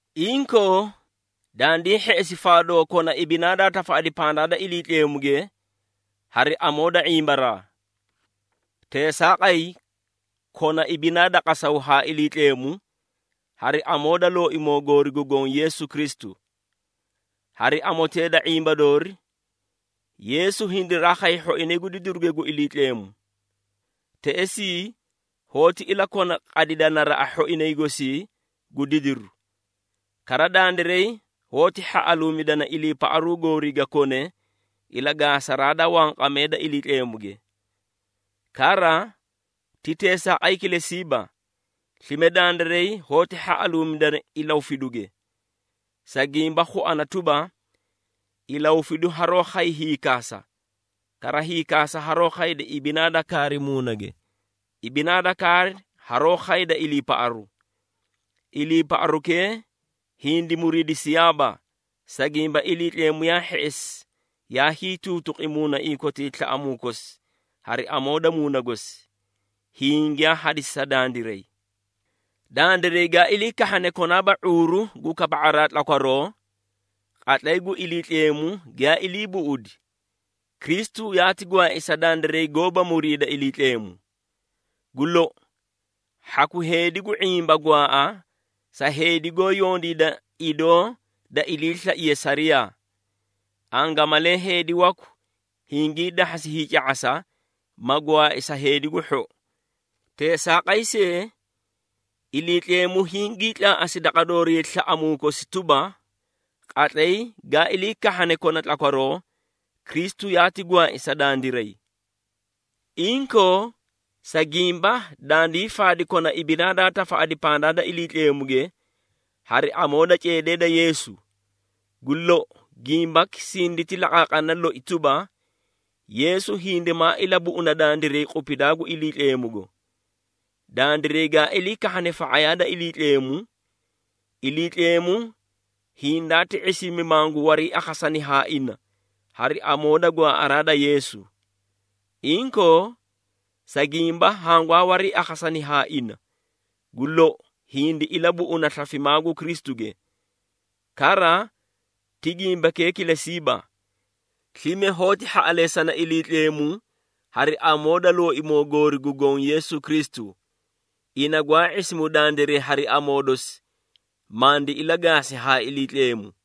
Inkoo, dandii hheꞌesi faadoo kona ibinaa daa tafaꞌadi pandaa da Iliitleemuge hari amoo da ⁄imbaraa. Teesaaqay, kona ibinaa da qasaw haa Iliitleemu hari amoo da Looimoo goori gu Goõ Yeesu Kristu. Hari amotee da ⁄imba doori, Yeesu hindiraa khay hhoinay gu didiruge gu Iliitleemu. Teꞌesii, yoóti ilakona qadida naraꞌa hhoinay gosii gu didiru. Kara, dandiray hoóti hhaꞌaluumidana iliipaꞌaru goorii ga kone ilagaasaraa da wanqamee da Iliitleemuge. Kara, ti teesaaqay kilesiiba, slime dandiray hoóti hhaꞌaluumidana ilahufiduge, sa gimba khuana tuba, ilahufidu haroó khay hiikaasa. Kara hiikaasa haroó khayda ibinaa da kaari muunage, ibinaa da kaari haroó khayda iliipaꞌaru. Iliiparukee hindi muriidisiyaaba, sa gimba Iliitleemu yaa hheꞌesi yaa hiituutuqi muunaiĩ kotii slaꞌamuu kosi hari amoo da Muuna gosi, hiĩ giyaa hadisi sa dandiray. Dandiray gaa ilii kahhane konaaba ⁄uuru gu kaba⁄araa tlakwaroo, qatlay gu Iliitleemu giyaa ilii buꞌudi, Kristu yaati gwaai sa dandiray goóba muriida Iliitleemu. Gu lou, hhaku heedi gu ⁄imba gwaaꞌa sa heedi goó yondiida idoo da iliislaiye sariyaa. Angamalee heedi waku hingii dahhasi hiica⁄asa, ma gwaai sa heedi gu hhou. Teesaaqay see, Iliitleemu hingii tlaaꞌasi daqa doori slaꞌamuu kosi tuba, qatlay gaa ilii kahhane kona tlakwaroo, Kristu yaati gwaai sa dandiray. Inkoo, sa gimba dandii faadi kona ibinaa daa tafaꞌadi pandaa da Iliitleemuge hari amoo da ceedee da Yeesu, gu lou gimbaki sinditi laqaaqana loi tuba, Yeesu hindimaa ilabuꞌuna dandiray qupidaa gu Iliitleemugo. Dandiray gaa ilii kahhane fa⁄ayaa da Iliitleemu, Iliitleemu hindaati ⁄isimi mangu wariiakhasani haa ina hari amoo da gwaaꞌaraa da Yeesu. Inkoo, sa gimba hangwaa wariiakhasani haa ina, gu lou hindi ilabuꞌuna slafimaa gu Kristuge. Kara, ti gimbakee kilesiiba. Slime hoóti hhaꞌaleesana Iliitleemu hari amoo da Looimoo goori gu Goõ Yeesu Kristu, ina gwaa ⁄isimu dandiray hari amoo dosi, mandi ilagaasi haa Iliitleemu.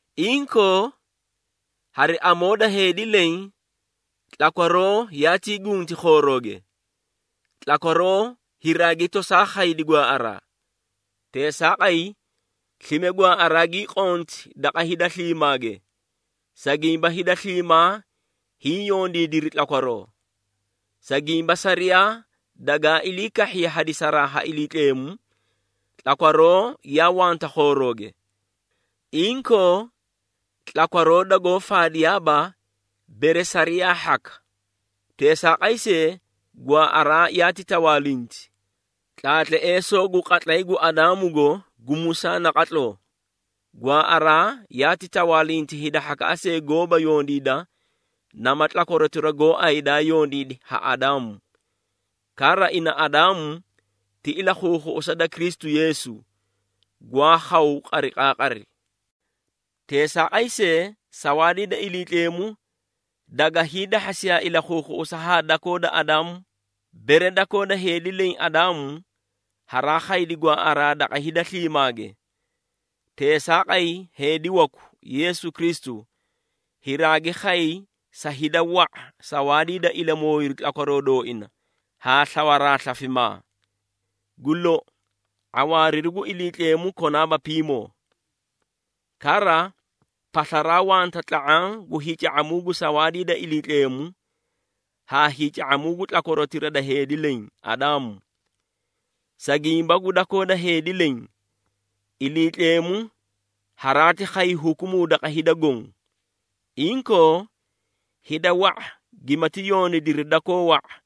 Inkoo, hari amoo da heedi leẽ, tlakwaroo yaatii gunti khoorooge, tlakwaroo hiraagi tosaa khaydi gwaaꞌaraa. Teesaaqay, slime gwaaꞌaraa gii qonti daqa hida sliimaage, sa gimba hida sliimaa hiĩ yondiidiri tlakwaroo. Sa gimba sariyaa dagaa ilii kahhiye hadisaraa ha Iliitleemu, tlakwaroo yaa wanta khoorooge. Inkoo, tlakwaroo dagoó faadiyaaba bere sariyaa hhaka. Teesaaqay see, gwaaꞌaraa yaati tawaalinti, tlaatleesoo gu qatlay gu Adaamugo gu Musaa naqatloo. Gwaaꞌaraa yaati tawaalinti hida hhakaꞌa see goóba yondiida nama tlakwarotira gooay daa yondiidi ha Adaamu. Kara, ina Adaamu ti ilakhuukhuꞌusa da Kristu Yeesu, gwaa khaw qariqaaqari. Teesaaqay see, sawaadii da Iliitleemu daga hiidahhasiyaa ilakhuukhuꞌusa haa dakoo da Adaamu. Bere dakoo da heedi leẽ, Adaamu, haraa khaydi gwaaꞌaraa daqa hida sliimaage, teesaaqay heedi waku, Yeesu Kristu, hiraagi khay sa hida wa⁄a sawaadii da ilamooyiru tlakwaroo dooina haa slawaraa slafimaa. Gu lou, ⁄awaariru gu Iliitleemu konaaba piimoo. Kara, paslaraa wanta tla⁄aã gu hiica⁄amuu gu sawaadii da Iliitleemu haa hiica⁄amuu gu tlakwarotira da heedi leẽ, Adaamu. Sa gimba gu dakoo da heedi leẽ, Iliitleemu haraati khay hukumuu daqa hida goõ. Inkoo, hida wa⁄a giyaamati yondiidiri dakoo wa⁄a,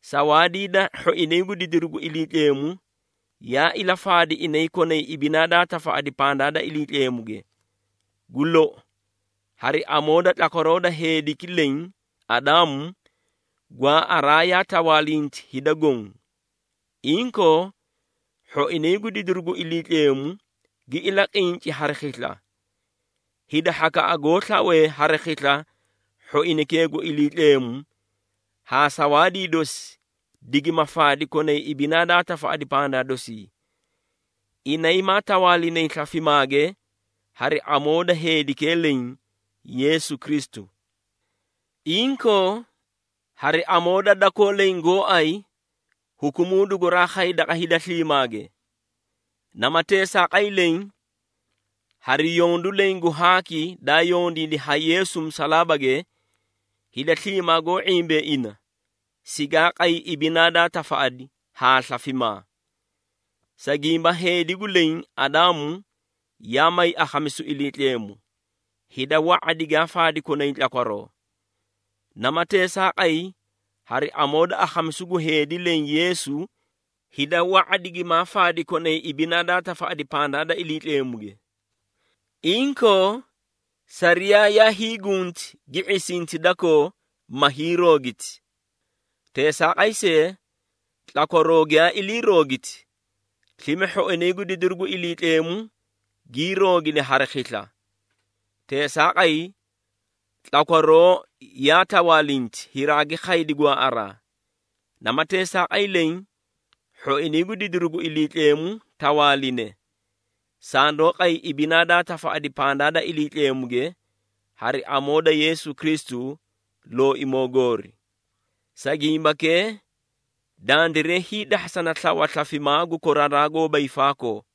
sawaadii da hhoinay gu didiru gu Iliitleemu, yaa ilafaadi inay konay ibinaa daa tafaꞌadi pandaa da Iliitleemuge. Gu lou, hari amoo da tlakwaroo da heediki leẽ, Adaamu, gwaaꞌaraa yaa tawaalinti hida goõ. Inkoo, hhoinay gu didiru gu Iliitleemu gi ilaqinci hari khisla. Hida hhakaꞌa goó slawee hari khisla hhoinaykee gu Iliitleemu haa sawaadii dosi digima faadi konay ibinaa daa tafaꞌadi pandaa dosii. Inay maa tawaalinay slafimaage hari amoo da heedikee leẽ, Yeesu Kristu. Inkoo, hari amoo da dakoo leẽ gooay, hukumuu duguraa khay daqa hida sliimaage. Nama teesaaqay leẽ, hari yondu leẽ gu haaki daa yondiidi ha Yeesu musalaabage, hida sliimaa goó ⁄imbee ina sigaa qay ibinaa daa tafaꞌadi haa slafimaa. Sa gimba heedikee gu leẽ, Adaamu, yaa may akhamisu Iliitleemu, hida wa⁄a digaa faadi konay tlakwaroo. Nama teesaaqay, hari amoo da akhamisu gu heedi leẽ, Yeesu, hida wa⁄a digimaa faadi konay ibinaa daa tafaꞌadi pandaa da Iliitleemuge. Inkoo, sariyaa yaa hiigunti gi ⁄isinti dakoo ma hiiroogiti. Teesaaqay see, tlakwaroo giyaa iliiroogiti, slime hhoinay gu didiru gu Iliitleemu gii roogidi hari khisla. Teesaaqay, tlakwaroo yaa tawaalinti haraagi khaydi gwaaꞌaraa. Nama teesaaqay leẽ, hhoinay gu didiru gu Iliitleemu tawaaline, sandoó qay ibinaa daa tafaꞌadi pandaa da Iliitleemuge hari amoo da Yeesu Kristu, Looimoo goori. Sa gimbakee, dandiray hiidahhasana slawa slafimaa gu koraraa gooba hiifaakoo.